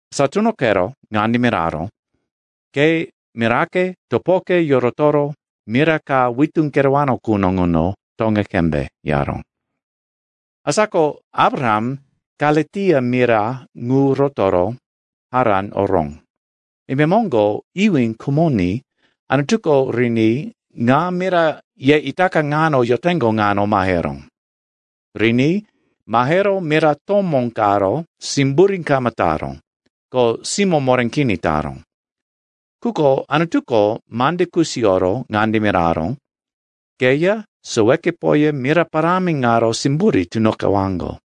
Asa tunoqero ŋande miraró, ‘Ke mirake, topoke yorotoro mira ka witú kerewano quno ŋuno toŋe qembe,’ yaró. “Asa ko Abraham Kalitia mira ŋu rotoro Haran oró. Imemoŋgo iwí khumoní Anutuko riní ŋa mira ye itaka ŋano yoteŋgo ŋano maheró. Riní mahero mira tomó karo simburí kama taró, ko simó moré kini taró. Quko Anutuko mande kusiyoro ŋande miraró, ‘Keya sowekepoya mira parámi ŋaro simburí tunoqewaŋgo.’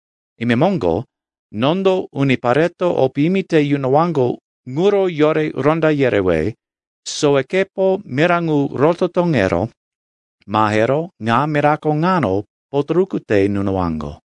Imemoŋgo nondo unipareto o piyimi te yunowaŋgo ŋuro yore ronda yerewe sowekepo mira ŋu roto toŋero mahero ŋa mirako ŋano potoruku te nunowaŋgo.’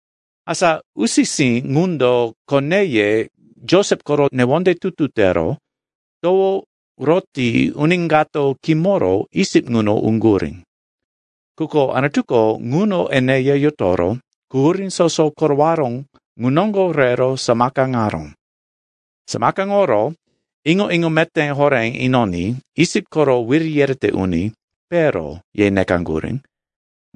“Asa usi-sí ŋundo koneye Josep koro newonde tutu tero towo roti uni kato kimoro Isip ŋuno uŋgurí. Quko Anutuko ŋuno eneya yotoro quhurí soso korowaró ŋu noŋgo rero samakaŋaró. Samakaŋoro iŋo-iŋo meté horé inoní Isip koro wiri yerete uni, “Pero,” ye nekaŋgurí,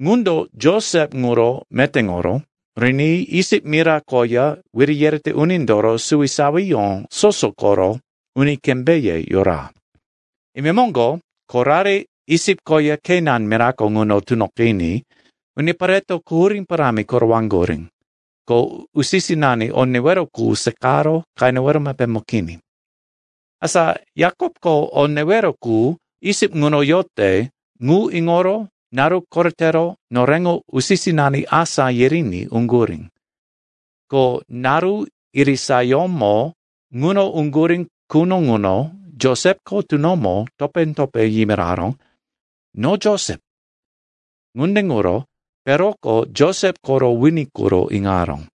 ŋundo Josep ŋuro metéŋoro riní Isip mira koya wiri yerete unindoro suwisawiyó soso koro uni kembéye yora. “Imemoŋgo korare Isip koya Kenan mirako ŋuno tunoqiní unipareto quhurí parámi korowaŋgurí, ko usi-sinani o newero qu seqaro qenewero mepémo kini. Asa Yakopko o newero qu Isip ŋuno yote ŋu iŋoro naru koretero noreŋo usi-sinani asá yiriní uŋgurí. Ko naru irisayómo ŋuno uŋgurí quno ŋuno Josepko tunomo topé-topé yimiraró, ‘No Josep.’ Ŋunde ŋuro Peroko Josep koro wini quro iŋaró.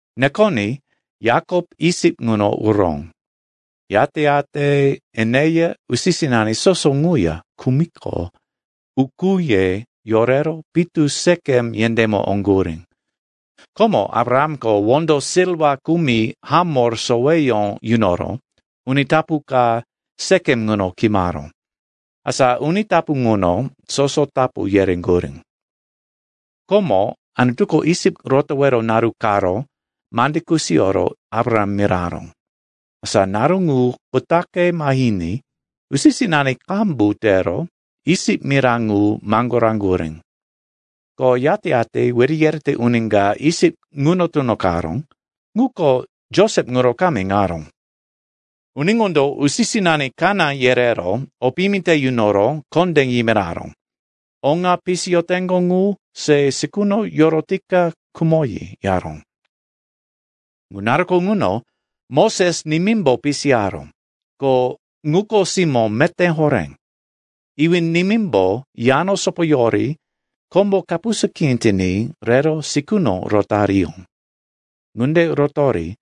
Nekoní Yakop Isip ŋuno uró. Yate-yate eneya usi-sinani soso ŋuya khumiqo, ukúye yorero pitu Sekem yendémo oŋgurí. Komo Abrahamko wondo silwa kumi Hamor soweyó yunoro uni tapu ka Sekem ŋuno kimaró. Asa uni tapu ŋuno soso tapu yereŋgurí. “Komo Anutuko Isip rotowero naru karo mande kusiyoro Abraham miraró. Asa naru ŋu kutaqe mahiní usi-sinani qambu tero Isip mira ŋu maŋgoraŋgurí. Ko yate-yate wiri yerete uni ka Isip ŋuno tunoqaró, ŋuko Josep ŋuro kama iŋaró. Uni ŋundo usi-sinani kaná yerero o piyimi te yunoro kondé yimiraró, oŋa pisiyoteŋgo ŋu se sikuno yorotika khumoyi, yaró. “Ŋu naruko ŋuno Moses nimímbo pisiyaró, ko ŋuko simó meté horé. Iwí-nimímbo yano sopoyori kombo kapusa kini tiní rero sikuno rotariyó. Ŋunde rotori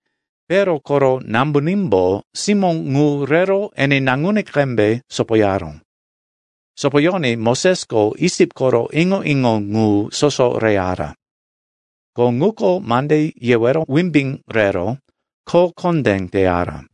Pero koro nambunímbo simó ŋu rero ene naŋuní qembe sopoyaró. Sopoyoní Mosesko Isip koro iŋo-iŋo ŋu soso reyara. Ko ŋuko mande yewero wimbí rero kho kondé teyara.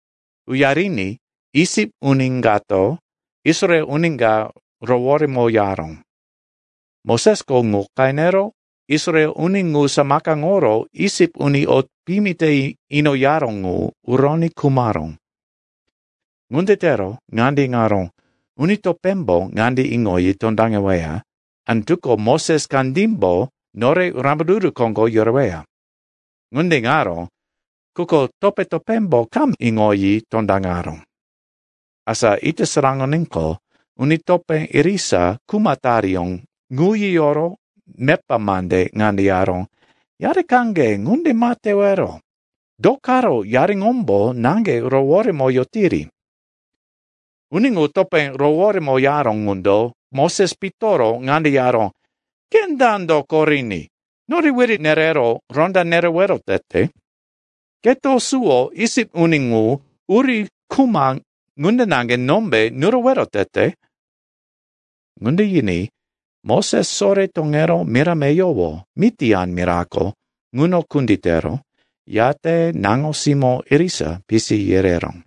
Uyariní Isip uni kato Israel uni ka roworemoyaró. Mosesko ŋu qenero Israel uni ŋu samakaŋoro Isip uni o piyimi te inoyaró ŋu uroní khumaró. Ŋunde tero ŋande iŋaró, uni topémbo ŋande iŋoyi tondaŋeweya, ‘Anutuko Moses kandímbo nore rambaruru koŋgo yoreweya.’ Ŋunde iŋaró, quko topé-topémbo kama iŋoyi tondaŋaró. Asa ita saraŋoníqo, uni topé irisa kuma tariyó ŋu yiyoro mepa mande ŋande yaró, ‘Yarikaŋge ŋunde ma tewero. Do karo yariŋombo naŋge roworemoyotiri?’ “Uni ŋu topé roworemoyaró ŋundo Moses pitoro ŋande yaró, ‘Ke dando koriní nore wiri nerero ronda nerewero tete? Keto suwo Isip uni ŋu uri khuma ŋunde naŋge nombe nurowero tete?’ Ŋunde yiní Moses sore toŋero mira meyowo, Mitian mirako, ŋuno kunditero, yate naŋo-simó irisa pisi yereró.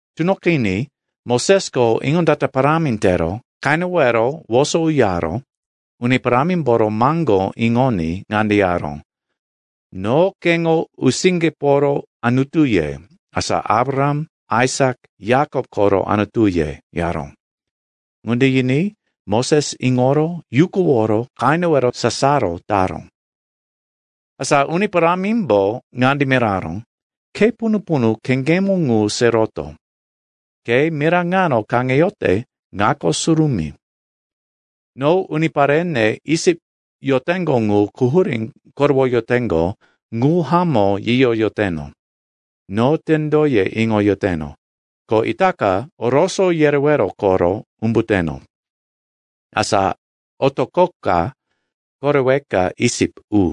Tunoqiní Mosesko iŋondata parámi tero qenewero woso uyaro Uni Parámimboro maŋgó iŋoní ŋande yaró, ‘No keŋo usiŋgeporo Anutuye, asa Abraham, Aisak, Yakop koro Anutuye,’ yaró. Ŋunde yiní Moses iŋoro yukuworo qenewero sasaro taró. “Asa Uni Parámimbo ŋande miraró, ‘Khe punu-punu kheŋgemo ŋu se roto. Ke mira ŋano kaŋeyote ŋako surumí. No uniparene Isip yoteŋgo ŋu quhurí korowoyoteŋgo ŋu hamó yiyoyoteno. No tendoye iŋoyoteno, ko itaka oroso yerewero koro umbuteno. Asa otoqoka koreweka Isip u.’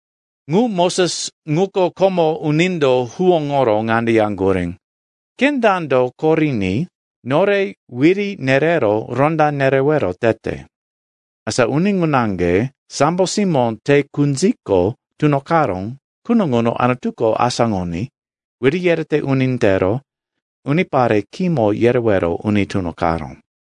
“Ŋu Moses ŋuko, komo unindo huwóŋoro ŋande yaŋgurí, ‘Ke dando koriní nore wiri nerero ronda nerewero tete?’ Asa uni ŋu naŋge, sambo simó te kunziko tunoqaró quno ŋuno Anutuko asáŋoní wiri yerete uni tero unipare kimo yerewero uni tunoqaró.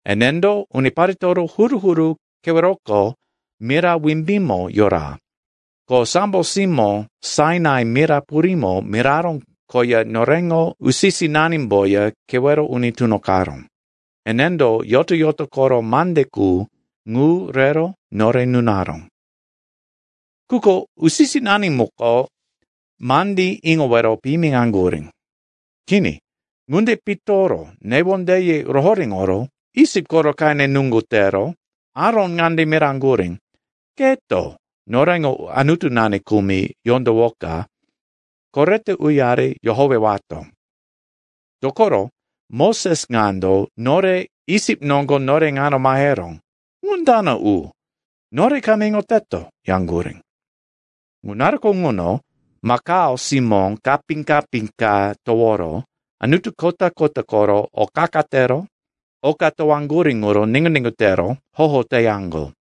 Enendo uniparetoro huru-huru keweroko mira wimbímo yora, ko sambo simó Sainai mira purímo miraró koya noreŋo usi-sinanimboya kewero uni tunoqaró. Enendo yoto-yoto koro mande qu ŋu rero nore nunaró. “Quko usi-sinani muko mandí iŋowero piyimiŋaŋgurí. Kini, ŋunde pitoro newondeye rohoréŋoro Isip koro qene nuŋgu tero Aron ŋande miraŋgurí, ‘Keto noreŋo anutunani kumi yondowoka korete uyari yohowewato. Dokoro Moses ŋando nore Isip noŋgo nore ŋano maheró, ŋu dana u, nore kama iŋoteto,’ yaŋgurí. Ŋu naruko ŋuno makao simó kapí-kapí ka toworo anutu kota-kota koro o qa-qa tero oka towaŋgurí ŋuro niŋgu-niŋgu tero hoho teyaŋgo.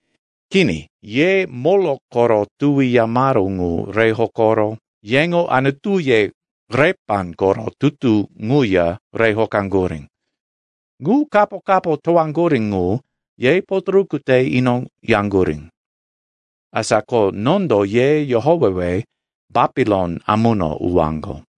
Kini, ye Molok koro tuwi yamaru ŋu re hokoro yeŋo anutuye Repan koro tutu ŋuya re hokaŋgurí. Ŋu kapo-kapo towaŋgurí ŋu ye potoruku te inoyaŋgurí. Asa ko nondo ye yohowewe Bapilon amuno uwaŋgo.’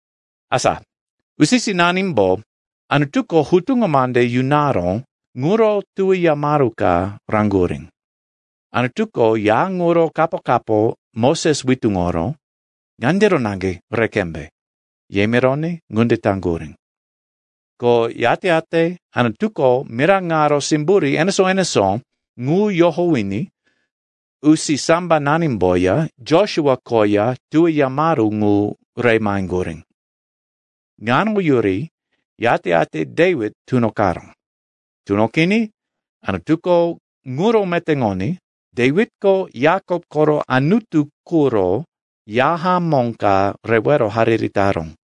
“Asa usi-sinanimbo Anutuko hutuŋo mande yunaró ŋuro tuwi yamaru ka raŋgurí. Anutuko ya ŋuro kapo-kapo Moses witúŋoro, ‘Ŋandiro naŋge re qembe,’ ye mironí ŋunde taŋgurí. Ko yate-yate Anutuko mira ŋaro simburí enesó-enesó ŋu yohowiní usisambananimboya Josua koya tuwi yamaru ŋu re maheŋgurí. Ŋano yuri, yate-yate Dewit tunoqaró. Tunoqiní Anutuko ŋuro metéŋoní Dewitko Yakop koro Anutu quro ya hamó ka rewero hariri taró.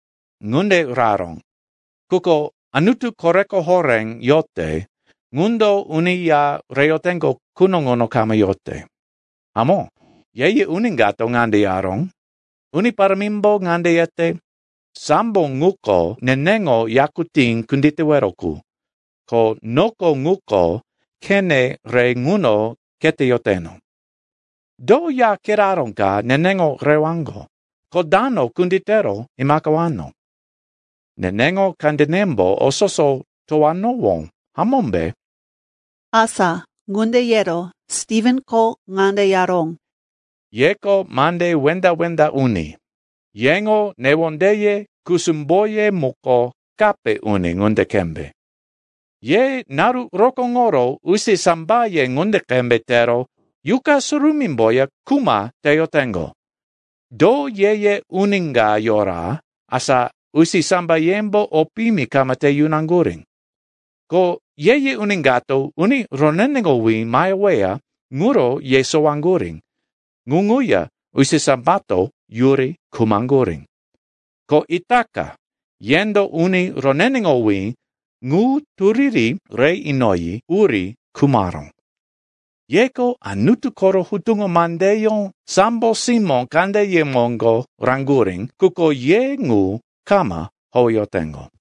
“Ŋunde raró, quko Anutu Koreko Horé yote ŋundo uni ya reyoteŋgo quno ŋuno kama yote. Hamó, ye-ye uni kato ŋande yaró, “Uni Parámimbo ŋande yete, ‘Sambo ŋuko neneŋo yakutí kunditewero qu ko noko ŋuko khene re ŋuno kheteyoteno. Do ya kiraró ka neneŋo rewaŋgo, ko dano kunditero imaqewano? Neneŋo kandenembo o soso towanowó, hamómbe?’” Asa ŋunde yero Stivenko ŋande yaró, “Yeko mande wenda-wenda uni. Yeŋo newondeye, kusumboye muko kape uni ŋunde qembe. Ye naru rokóŋoro usisambaye ŋunde qembe tero Yuqa Surumímboya kuma teyoteŋgo. Do ye-ye uni ka yora, asa usisambayembo o piyimi kama te yunaŋgurí? Ko ye-ye uni kato uni roneneŋowí maheweya ŋuro yesowaŋgurí, ŋu ŋuya usisambato yuri khumaŋgurí. Ko itaka yendo uni roneneŋowí ŋu turiri re inoyi uri khumaró. Yeko Anutu koro hutuŋo mandeyó sambo simó kandeye moŋgo raŋgurí, quko ye ŋu kama howeyoteŋgo.”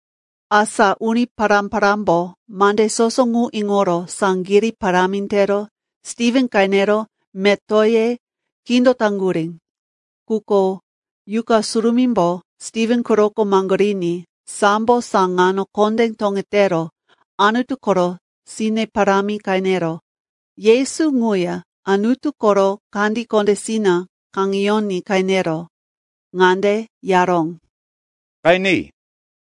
Asa uni pará-parámbo mande soso ŋu iŋoro saŋgirí parámi tero Stiven qenero metoye kindotaŋgurí. Quko Yuqa Surumímbo Stiven quroko maŋgoriní, sambo saŋano kondé toŋetero Anutu koro sine parámi qenero, Yesu ŋuya Anutu koro kandí kondésina kaŋeyoní qenero ŋande yaró, “Qeni!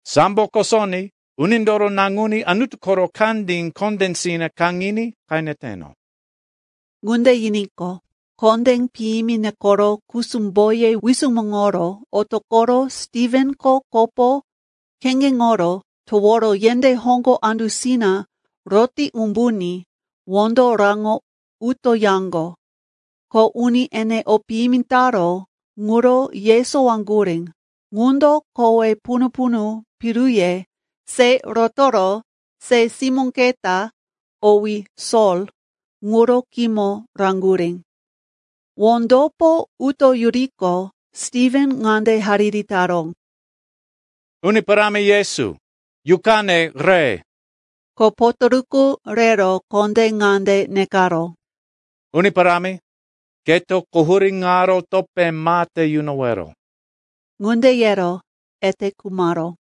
Sambo kosoní Unindoro Naŋuní Anutu koro kandí kondésina kaŋiní qeneteno.” Ŋunde yiníqo, kondé piyimi nekoro kusumboye wisumuŋoro otoqoro Stivenko kopo kheŋgeŋoro toworo yendé hoŋgo andusina roti umbuní wondo raŋo utoyaŋgo. Ko uni ene o piyimi taró ŋuro yesowaŋgurí ŋundo kowe punu-punu piruye se rotoro se simó keta, owí Sol, ŋuro khímo raŋgurí. Wondopo utoyuriqo, Stiven ŋande hariri taró, “Uni Parámi Yesu, yuqane re!” Ko potoruku rero kondé ŋande nekaró, “Uni Parámi, keto quhurí ŋaro topé ma te yunowero.” Ŋunde yero ete khumaró.